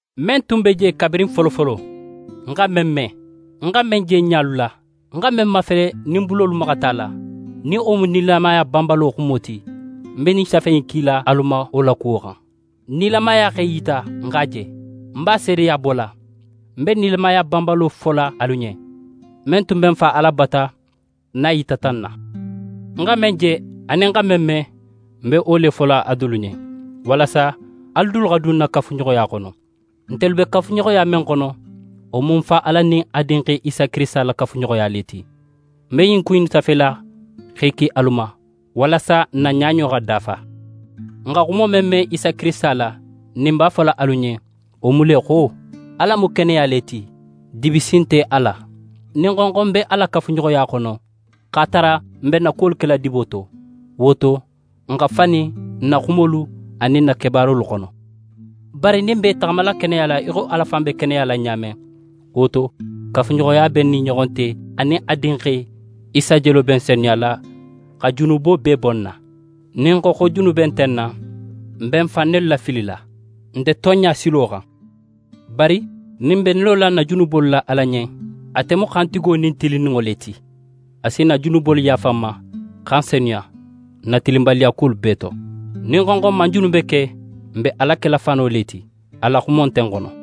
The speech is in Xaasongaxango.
Men tun be je kabirin folofolo, n xa men me, n xa men je n ɲalu la, n xa men mafele nin n bulolu maxata a la, nin wo mu nilamaya banbalo Xumo ti, ń be ɲin safe in kila alu ma wo la kuwo xan. Nilamaya x'é yita, n x'a je, n b'a seedeya bola. N be nilamaya banbalo fola alu ɲen, men tun be Fa Ala bata n'a yitata n na. N xa men je anin n xa men me, n be wo fola alu dulu ɲen, walasa alu dulu xa dun n na kafuɲoxoya xono. Ntelu be kafuɲoxoya men xono, wo mu Fa Ala anin a Dinxe Isa Kirisita la kafuɲoxoya le ti. N be ɲin ku innu safela x'e ki alu ma, walasa n na ɲaɲo xa dafa. N xa xumo men me Isa Kirisita la, nin n b'a fola alu ɲen, wo mu le xo: Ala mu keneya le ti, dibi si nte a la. Nin n xo, xo n be a la kafuɲoxoya xono, x'a tara n be n na kuwolu kela dibo to, wo to, n xa fani n na xumolu anin n na kebaarolu xono. Bari nin n be i taxamala keneya la í xo Ala fan be keneya la ɲa men, wo to, kafuɲoxoya be n nin i ɲoxo te anin a Dinxe Isa jelo be n senuyala xa junubo bee bo n na. Nin n xo xo junube nte n na, n be n fan nelu lafilila, n nte tonɲa silo xan. Bari nin n be n lola n na junubolu la Ala ɲen, ate mu xantigo nin tilinninŋo le ti, a si n na junubolu yaafa n ma, xa n senuya n na tilinbaliyakuwolu bee to. Nin n xo xo n man junube ke, n be Ala kela fano le ti, a la xumo nte n xono.